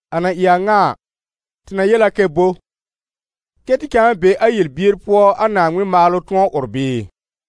A na ɩ a ŋa a, tɩ na yel a kɛ bo? Kɛ́ tɩ cãa be a yel-bier pʋɔ a Naaŋmɩn maalʋ tʋ̃ɔ ʋr bɩɩ?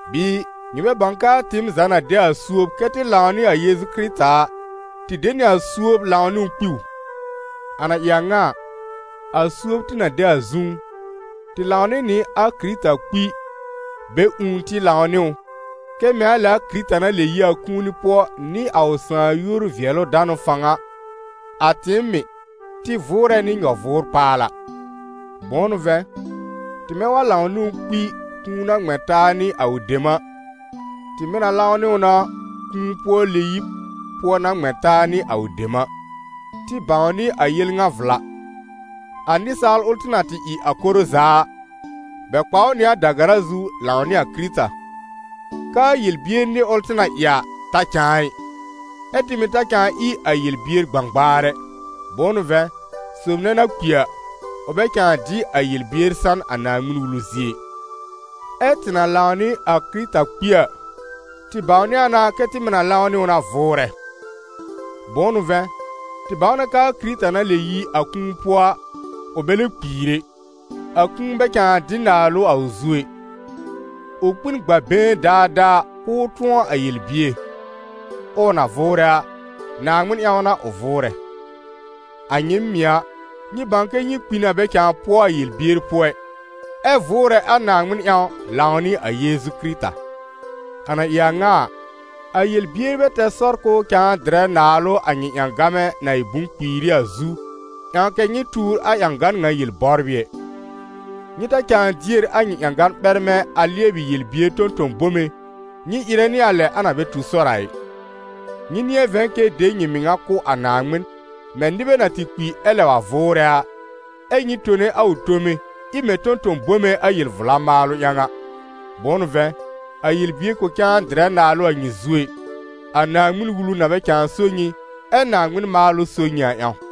Bɩɩ nyɩ bɛ bãw k'aa tɩɩm za na de a suob kɛ́ tɩ lãw nɩ a Yeezu Kɩrɩta a, tɩ de nɩ a suob lãw nɩ ʋ kpi ʋ? A na ɩ a ŋa a, a suob tɩ na de a zũú, tɩ lãw nɩ nɩ a Kɩrɩta kpi, bɛ ũù tɩ lãw nɩ ʋ, kɛ mɛ̃ a lɛ a Kɩrɩta na lɛb yi a kũuni pʋɔ nɩ a ʋ Sãà yúor-vɩɛlʋ-danʋ fãw a, a tɩɩm mɩ̀, tɩ vʋʋrɛ nɩ nyɔ-vʋʋr-paala. Bʋ̃ʋ n'ʋ vɛ̃, tɩmɛ wa lãw nɩ ʋ kpi kũu na ŋmɛ̃ taa nɩ a ʋ dem a, tɩ mɩ̀ na lãw nɩ ʋ na kũu-pʋɔ-lɛ-yib pʋɔ na ŋmɛ̃ taa nɩ a ʋ dem a. Tɩ bãwnɩ a yel ŋa vla: a nɩsaal ʋl tɩ na tɩ ɩ a koro za a, bɛ kpa ʋ nɩ a da-gara zu lãw nɩ a Kɩrɩta, k'aa yel-bier nɩr ʋl tɩ na ɩ a, ta cãa ɩ, ɛ́ tɩ mɩ̀ ta cãa ɩ a yel-bier gbãgbaar ɛ. Bʋ̃ʋ n'ʋ vɛ̃, sob nɛ na kpi a, ʋ bɛ cãa dɩ a yel-bier san a Naaŋmɩn-Wulu zie ɩ. Ɛ́ tɩ na lãw nɩ a Kɩrɩta kpi a, tɩ bãwnɩ a na kɛ tɩ mɩ̀ na lãw nɩ ʋ na vʋʋrɛ. Bʋ̃ʋ n'ʋ vɛ̃, tɩ bãw na k'aa Kɩrɩta na lɛb yi a kũu pʋɔ a, ʋ bɛ lɛ kpiir ɛ, a kũu bɛ cãa dɩ naalʋ a ʋ zu ɛ. Ʋ kpi n gb'a been daadaa k'ʋʋ tʋ̃ɔ a yel-bier; ɛ ʋ na vʋʋrɛ a, Naaŋmɩn ƴãw n'a ʋ vʋʋrɛ. A nyɩɩm mɩ̀ a, nyɩ bãw kɛ nyɩ kpi na bɛ cãa pʋɔ a yel-bier pʋɔ ɩ, ɛ vʋʋrɛ a Naaŋmɩn ƴãw lãw nɩ a Yeezu Kɩrɩta. A na ɩ a ŋa a, a yel-bier bɛ tɛr sɔr k'ʋʋ cãa dɩrɛ naalʋ a nyɩ ƴãgan na ɩ bʋ̃-kpiira a zu, ƴãw kɛ nyɩ tuur a ƴãgan ŋa yel-bɔbrɩ ɛ. Nyɩ ta cãa dier a nyɩ ƴãgan ɓɛrmɛ̃ a lɩɛbɩ yel-bier tõ-tõ-bome, nyɩ ɩrɛ nɩ a lɛ na bɛ tu sɔr a ɩ. Nyɩ nɩ̃ɛ vɛ̃ kɛ de nyɩ mɩŋa kʋ̀ a Naaŋmɩn, mɛ̃ nɩbɛ na tɩ kpi ɛ lɛb wa vʋʋrɛ a, ɛ́ nyɩ tone a ʋ tome, ɩ mɛ̃ tõ-tõ-bome a yel-vla maalʋ ƴãw a. Bʋ̃ʋ n'ʋ vɛ̃, a yel-bier kʋ̃ cãa dɩrɛ naalʋ a nyɩ zu ɛ, a Naaŋmɩn-Wulu na bɛ cãa so nyɩ, ɛ́ Naaŋmɩn maalʋ so nyɩ a ƴãw.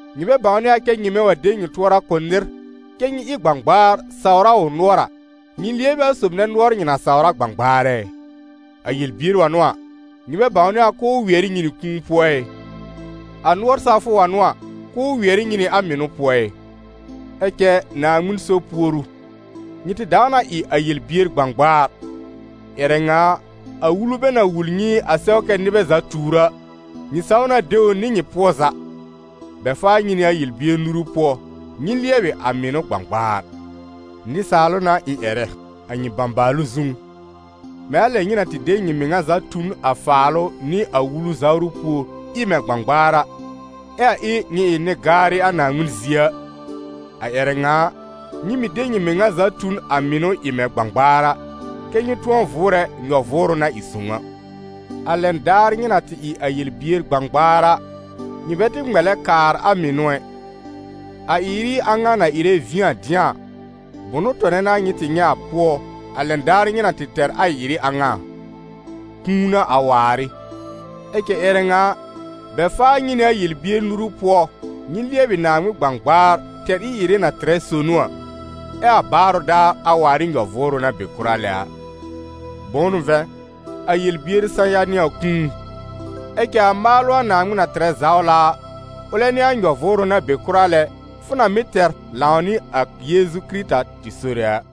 Nyɩ bɛ bãwnɩ a kɛ nyɩmɛ wa de nyɩ tʋɔra kʋ̀ nɩr, kɛ́ nyɩ ɩ gbãgbaar sawr a ʋ nʋɔr a, nyɩ lɩɛb ɩ a sob nɛ nʋɔr nyɩ na sawr a gbãgbaar ɛ? A yel-bier wa n'ʋ a, nyɩ bɛ bãwnɩ a k'ʋʋ wɩɛr ɩ nyɩ nɩ kũu pʋɔ ɩ? A nʋɔr sawfʋ wa n'ʋ a, k'ʋʋ wɩɛr ɩ nyɩ nɩ a mɩnʋ pʋɔ ɩ? Ɛ cɛ Naaŋmɩn so puoru: nyɩ tɩ dãw na ɩ a yel-bier gbãgbaar, ƴɛrɛ ŋa a, a wulu bɛ na wul nyɩ a sɛw kɛ nɩbɛ za tuur a, nyɩ saw na de ʋ nɩ nyɩ pʋɔ za. Bɛ faa nyɩ nɩ a yel-bier nuru pʋɔ, nyɩ lɩɛbɩ a mɩnʋ gbãgbaar. Nɩsaalʋ n'a ɩ̃ ƴɛrɛ, a nyɩ bãbaalʋ zũú. Mɛ̃ a lɛ nyɩ na tɩ de nyɩ mɩŋa za tu n a faalʋ nɩ a Wulu zawrʋ pùor, ɩ mɛ̃ gbãgbaar a, ɛ a ɩ nyɩ ɩ nɩ-gaarɩ a Naaŋmɩn zie a, a ƴɛrɛ ŋa a, nyɩ mɩ̀ de nyɩ mɩŋa za tu n a mɩnʋ ɩ mɛ̃ gbãgbaar a, kɛ́ nyɩ tʋ̃ɔ vʋʋrɛ nyɔ-vʋʋrʋ na ɩ sõw a. A lɛn daar nyɩ na tɩ ɩ a yel-bier gbãgbaar a, nyɩ bɛ tɩ ŋmɛlɛ kaar a mɩnʋ ɛ. A ɩ-ɩrɩ a ŋa na ɩrɛ vĩ a dɩ̃a a, bʋnʋ tɔnɛ n'a nyɩ tɩ nyɛ̃ a pʋɔ, a lɛn daar nyɩ na tɩ tɛr a ɩ-ɩrɩ a ŋa a? Kũu n'a a waar ɩ. Ɛ cɛ ƴɛrɛ ŋa a, bɛ faa nyɩ nɩ a yel-bier nuru pʋɔ, nyɩ lɩɛbɩ Naaŋmɩn gbãgbaar tɛr ɩ-ɩrɩ na tɩrɛ sonu a, ɛ a baarʋ daar a waar ɩ nyɔ-vʋʋrʋ na be kʋra lɛ a. Bʋ̃ʋ n'ʋ vɛ̃, a yel-bier sã-ya n'ɩ a kũu; ɛ cɛ a maalʋ a Naaŋmɩn na tɩrɛ zawla a, ʋlɛ n'ɩ a nyɔ-vʋʋrʋ na be kʋra lɛ fʋ na mɩ́ tɛr lãw nɩ a Yeezu Kɩrɩta tɩ Sore a.